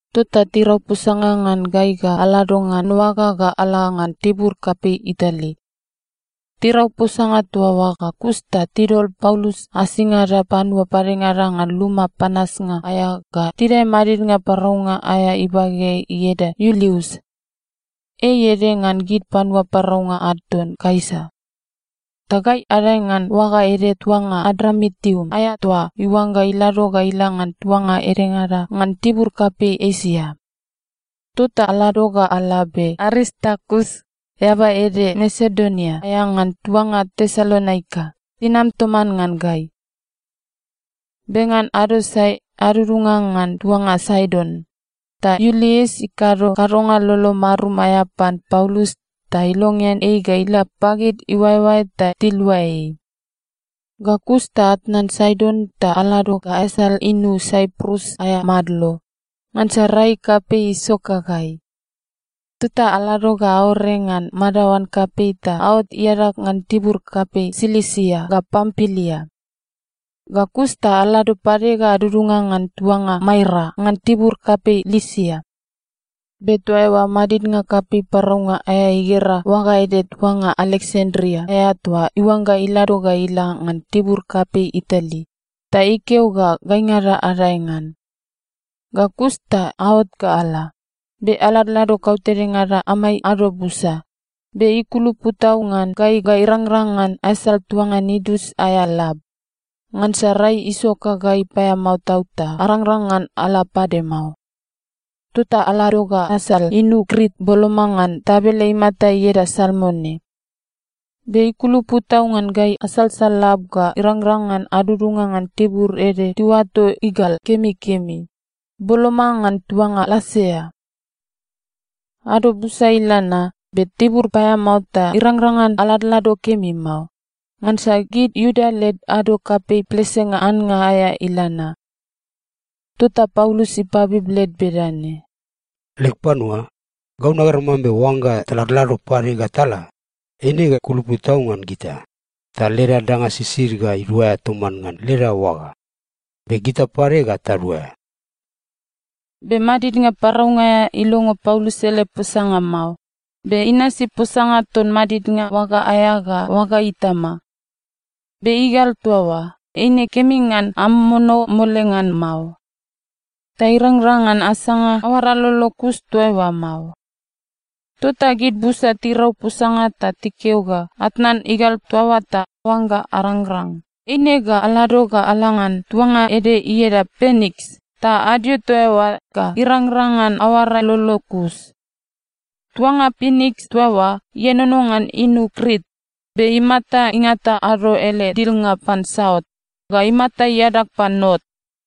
Tota tirau posanga ngan gai ga alado ngan oaga ga ala ngan tibur kapei Itali. Tirau posanga toa oa ga kus ta tidol Paulus asingada panua padengada ngan luma panasnga aea ga tidae madidnga paraunga aea ibageai ieda Iulius. Ei ede ngan gid panua paraunga ad ton Kaisa. Ta gai adae ngan oaga ede tuanga Adramitium aea toa iuangga ilado ga ila ngan tuanga edengada ngan tibur kapei Esia. Tota alado ga ala, be Aristarkus, eaba ede Masedonia aea ngan tuanga Tesalonika, inam toman ngan gai. Be ngan ado sae adudunga ngan tuanga Saidon, ta Iulius ikado kadonga lolo marum aea pan Paulus ta ilongean ei ga ila pagid iuaeoae ta tilua ei. Ga kus ta atnan Saidon ta alado ga asal inu Saiprus aea madlo, ngansa rai kapei isoka gai. Tota alado ga aore ngan madaoan kapei ta aot iadag ngan tibur kapei Silisia ga Pampilia. Ga kus ta alado pade ga adudunga ngan tuanga Maira ngan tibur kapei Lisia. Be toa eoa madidnga kapei paraunga aea igera oaga ede tuanga Aleksandria aea toa iuangga ilado ga ila ngan tibur kapei Itali, ta ikeo ga gaingada adae ngan. Ga kus ta aot ga ala, be aladlado kautedengada amai ado busa, be ikulupu tau ngan gai ga irangrang ngan asal tuanga Nidus aea lab. Ngansa rai isoka gai paeamao tau ta arangrang ngan ala pade mao. Tota alado ga asal inu Krit boloma ngan tabele imata ieda Salmone. Be ikulupu tau ngan gai asalsal lab ga irangrang ngan adudunga ngan tibur ede tiuato Igal Kemikemi, boloma ngan tuanga Lasea. Ado busa ila na, be tibur paeamao ta irangrang ngan aladlado kemi mao, ngansa gid Iuda led ado kapei plesenga annga aea ila na. Tota Paulus ipabib led bedane, “Leg panua, gau nagera mambe oangga taladlado pade ga tala, eine ga kulupu tau ngan gita, ta leda danga sisid ga iduaea toman ngan leda oaga, be gita pade ga taduaea.” Be madidnga paraunga aea ilongo Paulus ele posanga mao, be inasi posanga ton madidnga oaga aea ga oaga itama. Be igal toa oa, eine kemi ngan amomono mole ngan mao. Ta irangrang ngan asanga aoara lolo kus toa eoa mao. Tota gid busa tirau posanga ta tikeo ga atnan igal toa oa ta oangga arangrang, eine ga alado ga ala ngan tuanga ede ieda Piniks ta adio toa eoa ga irangrang ngan aoara lolo kus. Tuanga Piniks toa oa ienono ngan inu Krit be imata ingata ado ele dilnga pan saut, ga imata iadag pan not.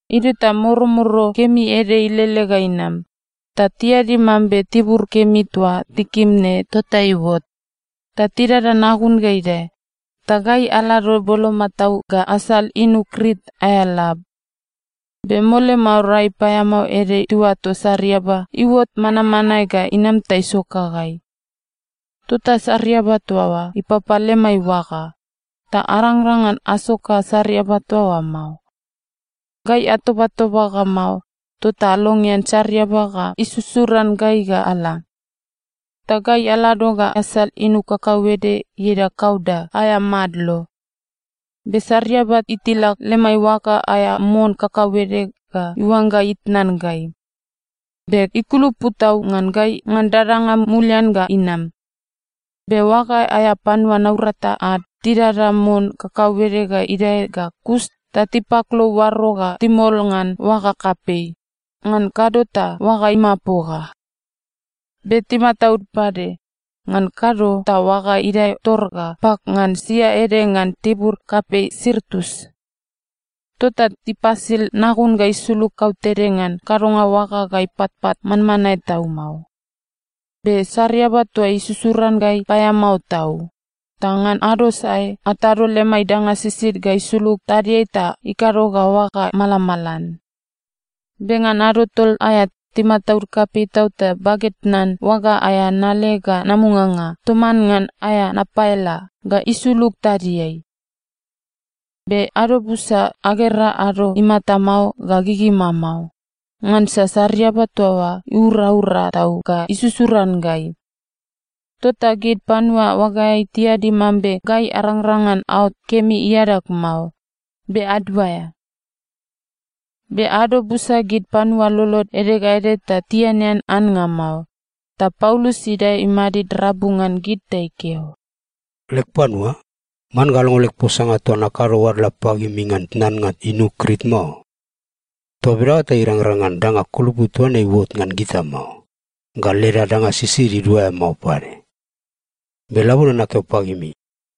Idio ta moromoro kemi ede ilele ga inam, ta tiadi mambe tibur kemi toa tikim ne tota iuot. Ta tidada nagun ga idae, ta gai alado boloma tau ga asal inu Krit aea lab. Be mole mao rai paeamao ede tiuato sariaba iuot manmanae ga inam ta isoka gai. Tota sariaba toa oa ipapa lemai oaga, ta arangrang ngan asoka sariaba toa oa mao. Gai atobatoba ga mao, tota alongean sariaba ga isusuran gai ga ala. Ta gai alado ga asal inu kakauede ieda Kauda aea madlo. Be sariaba itilak lemai oaga aea mon kakauede ga iuangga itnan gai, be ikulupu tau ngan gai ngan dadanga mulian ga inam. Be oaga aea panua naurata ad tidada mon kakauede ga idae ga kus ta tipaklou oaro ta timol ngan oaga kapei, ngan kado ta oaga imapoga. Be timataud pade, ngan kado ta oaga idae tor ga pak ngan sia ede ngan tibur kapei Sirtus. Tota tipasil nagun ga isulug kautede ngan kadonga oaga ga ipatpat manmanae tau mao. Be sariaba toa isusuran gai paeamao tau, ta ngan ado sae atado lemai danga sisid ga isulug tadiai ta ikado ga oaga malamalan. Be ngan ado tol aea timataud kapei tau ta baged tnan oaga aea nale ga namuganga toman ngan aea napaela ga isulug tadiai. Be ado busa agera ado imata mao ga gigima mao, ngansa sariaba toa oa iuraura tau ga isusuran gai. Tota gid panua oagaeai tiadi mambe gai arangrang ngan aot kemi iadag mao, be aduaea. Be ado busa gid panua lolod ede ga ede ta tianean annga mao, ta Paulus idae imadid rabu ngan gid ta ikeo, “Leg panua, man ga alongo leg posanga toa nakado oadla pagimi ngan tatnan inu Krit mao. Toa bedaoa ta irangrang ngan danga kulupu toa ne iuot ngan gita mao, ga leda danga sisid iduaea mao pade. Be labone nakeo pagimi,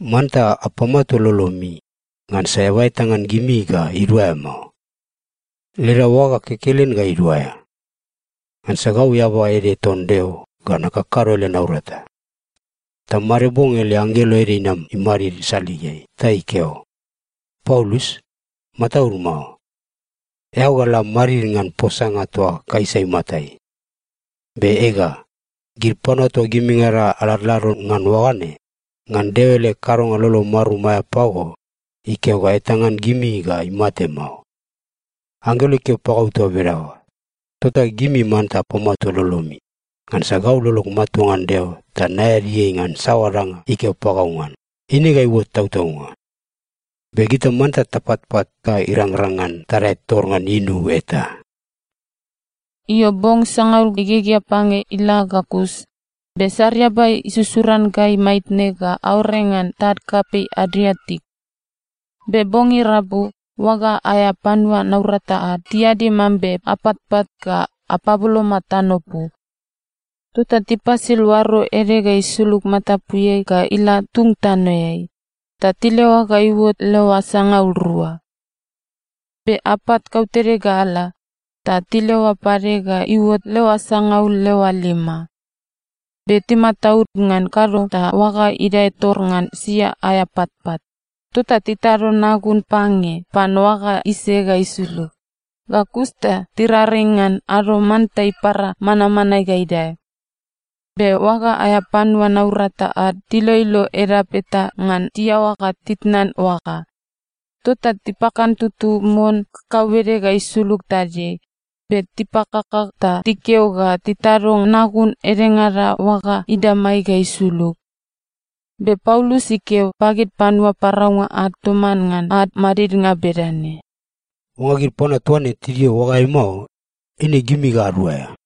manta apamatua lolomi, ngansa eaba eta ngan gimi ga iduaea mao. Leda oaga kekelen ga iduaea. Ngansa gau eaba ede ton Deo ga nakakado ele naurata. Ta made bong ele anggelo ede inam imadid saligeai ta ikeo, ‘Paulus, mataud mao. Eao ga la madid ngan posanga toa Kaisa imatai. Be ega, gid panua toa gimingada aladlado ngan oaga ne, ngan Deo ele kadonga lolo marum aea pago, ikeo ga eta ngan gimi ga imate mao.’ Anggelo ikeo pagau toa bedaoa, tota gimi manta apamatua lolomi, ngansa gau lolog matua ngan Deo ta naeadi ei ngan saoa danga ikeo pagau ngan, eine ga iuot tautaunga. Be gita manta tapatpat ga irangrang ngan tadae tor ngan inu eta.” Io, bong sangaul igegea pange ila ga kus, be sariaba isusuran gai maitne ga aore ngan tad kapei Adriatik. Be bong irabu, oaga aea panua naurata ad tiadi mambe apatpat ga apaboloma tanopu. Tota tipasil oaro ede ga isulug matapuiai ga ila tung tanoeai, ta tileoa ga iuot leoa sangaul rua. Be apat kautede ga ala, ta tileoa pade ga iuot leoa sangaul leoa lima. Be timataud, ngan kado ta oaga idae tor ngan sia aea patpat, tota titado nagun pange pan oaga ise ga isulug. Ga kus ta tiraring ngan ado manta ipara manmanae ga idae. Be oaga aea panua naurata ad tiloilo edap eta ngan tiaoa ga titnan oaga, tota tipakantutu mon kakauede ga isulug tadiai. Be tipakaka ta tikeo ga titado nagun edengada oaga idamai ga isulug. Be Paulus ikeo pagid panua paraunga ad toman ngan ad madidnga bedane, “Oangga gid panua toa ne tidio oagaeai mao, eine gimi ga aduaea.”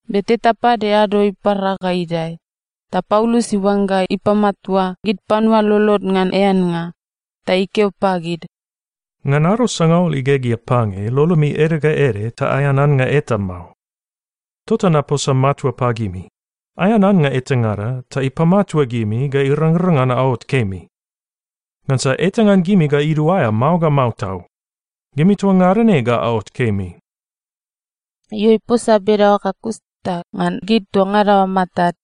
Be teta pade ado ipara ga idae, ta Paulus iuangga ipamatua gid panua lolod ngan eannga, ta ikeo pagid, “Ngan ado sangaul igegea pange lolomi ede ga ede ta aean annga eta mao. Tota naposa matua pagimi, aean annga etangada ta ipamatua gimi ga irangrang ngan aot kemi. Ngansa eta ngan gimi ga iduaea mao ga mao tau. Gimi toa ngada ne ga aot kemi.” Io, iposa bedaoa ga kus ta ngan gid toa ngada oa matad,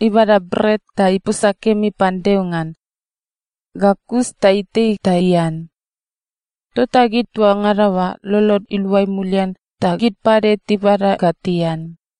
ibada bret ta iposa kemi pan Deo ngan. Ga kus ta itei ta ian. Tota gid toa ngada oa lolod iluai mulian ta gid pade tibada ga tian.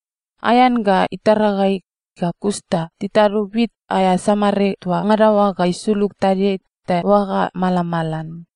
Aean ga itara gai ga kus ta titado wit aea samare toa ngada oa ga isulug tadiai ta oaga malamalan.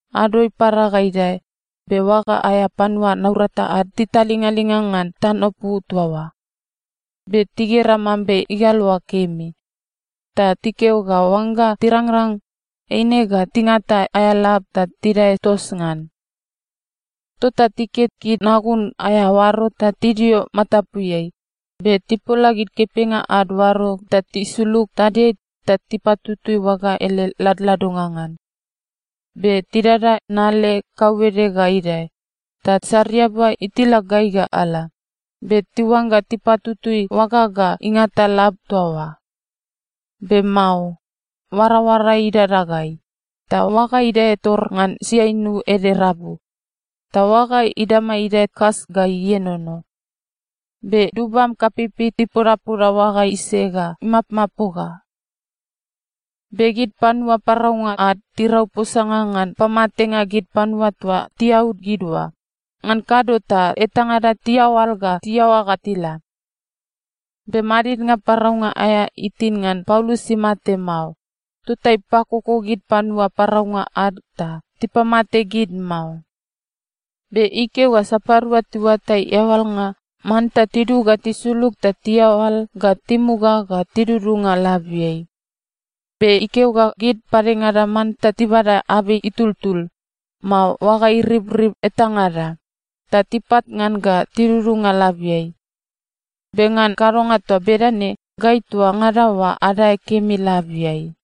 Ado ipara ga idae, be oaga aea panua naurata ad titalingalinga ngan tanopu toa oa. Be tigera mambe igal oa kemi, ta tikeo ga oangga tirangrang, eine ga tingata aea lab ta tidae tos ngan. Tota tiket gid nagun aea oaro ta tidio matapuiai, be tipola gid kepenga ad oaro ta tisulug tadiai ta tipatutui oaga ele ladladonga ngan. Be tidada nale kakauede ga idae, ta sariaba itilak gai ga ala, be tiuangga tipatutui oaga ga ingata lab toa oa. Be mao. Oaraoara idada gai, ta oaga idae tor ngan siainu ede rabu, ta oaga idama idae kas ga ienono. Be dubam kapeipei ipodapoda oaga ise ga imapmapoga. Be gid panua paraunga ad tirau posanga ngan pamatenga gid panua toa tiaud gid oa, ngan kado ta etangada tiaoal ga tiaoa ga tila. Be madidnga paraunga aea itin ngan Paulus imate mao, tota ipakoko gid panua paraunga ad ta tipamate gid mao. Be ikeo ga sapadua tiuatai eaoalnga, manta tidug ga tisulug ta tiaoal ga timuga ga tidudunga labiai. Be ikeo ga gid padengada manta tibada abei itultul, mao oaga iribrib etangada, ta tipat ngan ga tidudunga labiai. Be ngan kadonga toa bedane gai toa ngada oa adae kemi labiai.